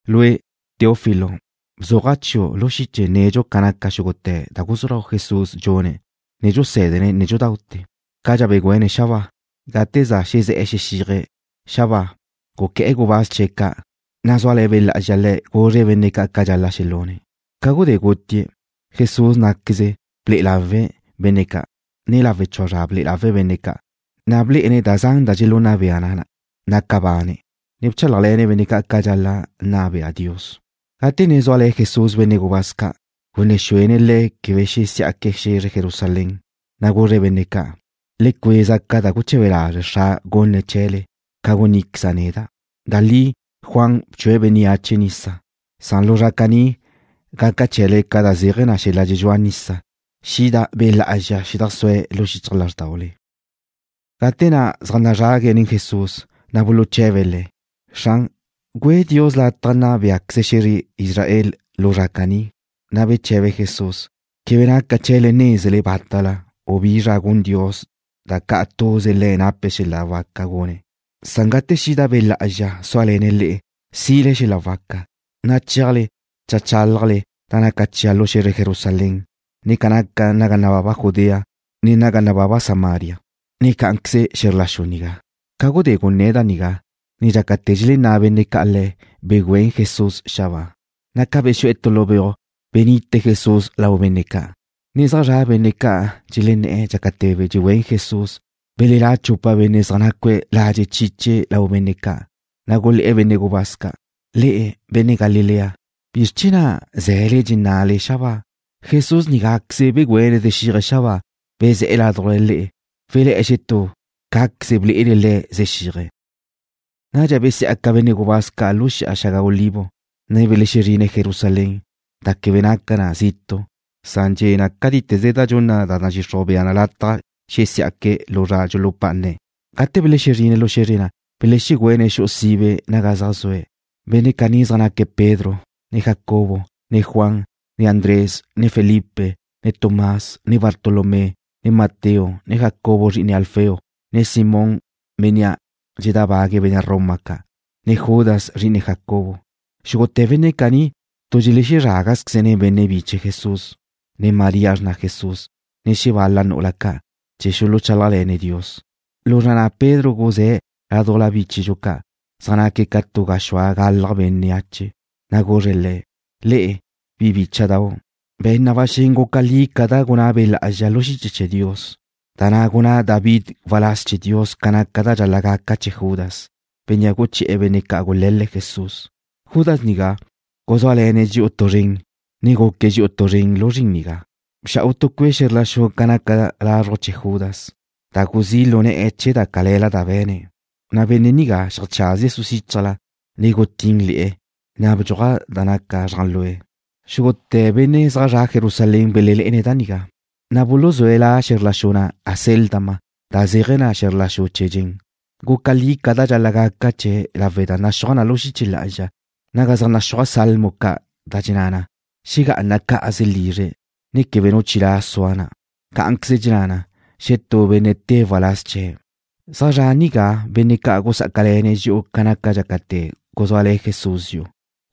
Lue', Teófilo, bzuaja' chiu' lu xiche nedxu ca naca xúgute̱ da guzú lau Jesús dxune̱', ne dxusé̱dene̱' nédxudaute̱, cadxa begüéne̱' xabáa. Gate za xezé̱'e̱ xexíaje̱' xabáa guqué̱'e̱ gubáz chee̱' ca', na' zúale̱ Be' Lá'azxa Le̱' guzre̱' benne' ca' ca da dxal-la' xelune̱'. Ca gudé gutie̱', Jesús ná'queze ble'e lawe̱' benne' ca', ne lawe' chua zra ble'e lawe̱' benne' ca', na' blé'ene̱' da zan da dxelunna bea na naca bane̱', ne bchálajle̱ne̱' benne' ca' ca dxal-la' nna bea Dios. Gate ne zúale̱ Jesús benne' gubáz ca', gunné̱ xuene̱' le̱' quebe xesí'aque̱' xe̱zre Jerusalén. Na' guzre̱' benne' ca': ―Le cueza ca da guche̱be lazre' Xra' gunne̱' chee̱le, ca gunníqueza' neda'. Da li Juan bchue̱' bénneache nisa, san lu zra caní gaca chee̱le ca da zéaje̱ xel-la' dxedxúa nisa, xida Be' Lá'azxa xedajsúe̱' lu xichaj lázrdaule. Gate na' zaj nazrague̱' nen Jesús, na' buluche̱be̱' Le̱': ―Xran, ¿güe Dios lataj nna béaqueze xe̱zre Israel lu zra caní? Na' beche̱be Jesús: ―Quebe naca chee̱le nézele bátala, u bi zra gun Dios da ca' tuze Le̱' nape̱' xel-la' waca gune̱'. Gate xida Be' Lá'azxa súale̱ne̱' le'e, sile xel-la' waca, na' chéajle cheajchálajle da naca chia' lu xe̱zre Jerusalén, ne ca naca naga nababa Judea, ne naga nababa Samaria, ne ca nácaqueze xe̱zr la xu nigá. Ca gudé gunné̱' da nigá, ne dxácate̱ dxelenná' benne' ca' Le̱', begüén Jesús xabáa, na' ca bexu'e̱ tu lu beuj benite Jesús lau benne' ca'. Ne zaj zra' benne' ca' dxelenné̱'e̱ dxácate̱ dxegüén Jesús, belelá' chupa benne' zaj nácue̱' ladxe' chiche lau benne' ca', na' gulé̱'e̱ benne' gubáz ca': ―Le'e, benne' Galilea, ¿bizr chee̱ na' ze̱le dxenna'le xabáa? Jesús nigáqueze begüéne̱' zexíaje̱' xabáa, bezé̱'e̱ ládujla le'e, welé̱'e̱ xetú cáqueze ble'ele Le̱' zexíaje̱'. Nadxa besí'aca benne' gubáz ca' lu Xi'a Xaga Olivo, ne belexezrine̱' Jerusalén, da quebe naca na zitu', san dxe' cátite̱ze da dxunna da nadxixruj bea na lataj xesí'aque̱' lu zra dxulupá'ane̱'. Gate belexezrine̱' lu xe̱zre na', belexegüéne̱' xu'u sibe naga zaj zue̱'. Benne' caní zaj naque̱' Pedro, ne Jacobo, ne Juan, ne Andrés, ne Felipe, ne Tomás, ne Bartolomé, ne Mateo, ne Jacobo zri'ine Alfeo, ne Simón, bénnea' dxedábague̱' benne' Roma ca', ne Judas, zri'ine Jacobo. Xúgute̱ benne' caní tu dxelezrágazqueze̱' nen benne' biche Jesús, ne María xrna Jesús, ne xebal-la nu'ula ca', chee̱ xuluchálajle̱ne̱' Dios. Lu zra ca' Pedro guzé̱' laduj bi bíchedxu ca', zaj naque̱' ca tu gaxúa galaj bénneache, na' guzre̱' le̱': ―Le'e, bi bícha'dau', be̱n na ba xen guca li ca da gunná Be' Lá'azxa lu xiche chee̱ Dios, da na' gunná David waláz chee̱ Dios ca naca da dxal-la' gaca chee̱ Judas, bénnea' guché̱'e̱ benne' ca' gule̱l-le̱' Jesús. Judas nigá guzúale̱ne̱' dxi'u tu zren, ne guque̱' dxi'u tuze lu zrin nigá. Bxa'u tu cue' xe̱zr la xu ca naca lazruj chee̱ Judas, da guzí' lu ne̱'e̱ chee̱ da cale̱la da be̱ne̱'. Na' benne' nigá xeajcházie̱' suxíchajla, ne gutín le̱'e̱, na' bdxuaj ca naca zrájlue̱'. Xúgute̱ benne' zaj zre̱'e̱ Jerusalén belenne̱' da nigá, na' buluzúe̱' la xe̱zr la xu na' Acéldama, da zéaje̱ na: Xe̱zr La Xu Chee̱ Dxen. Guca li ca da dxal-la' gaca chee̱' lawe' da naxúaj lu xiche lá'azxa naga zaj naxúaj salmo ca', da dxenná na: Xegá'ana cá'aze lizre̱', ne quebe nu chilá' sua na'. Cá'anqueze dxenná na: Xetú benne' tée̱' waláz chee̱'. ’Zaj zra' nigá benne' ca' gusá'acale̱ne̱' dxi'u ca naca dxácate̱ guzúale̱ Jesús dxi'u.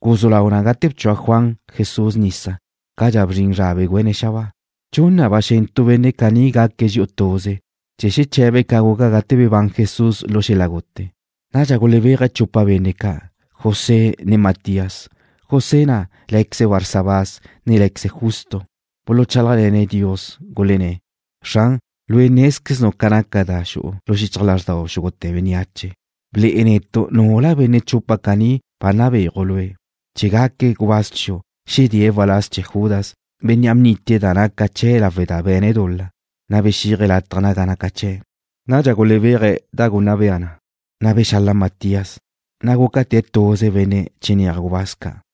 Guzú lau na gate bchua Juan Jesús nisa, cadxa bzrin zra begüéne̱' xabáa. Dxun na ba xen tu benne' caní gaque̱' dxi'u tuze chee̱ xeche̱be̱' ca guca gate bebán Jesús lu xel-la' gute. Nadxa gulebéaje̱' chupa benne' ca', José ne Matías. José na' lé̱queze̱' Barsabás ne lé̱queze̱' Justo. Buluchálajle̱ne̱' Dios, gulenné̱': ―Xran, Lue' nézqueznu' ca naca da xu'u lu xichaj lázxdau xúgute̱ bénneache. Ble'e netu' nula benne' chupa caní ba nabéaju' Lue', chee̱ gaque̱' gubáz chiu', ne xedée̱' waláz chee̱ Judas, bénnea' bnitie̱' da naca chee̱' lawe' da be̱ne̱' dul-la, na' bexíaje̱' lataj naga naca chee̱'. Nadxa gulebéaje̱' da gaca bea na, na' bexala Matías, na' gúcate̱' tuze benne' chinéaj gubáz ca'.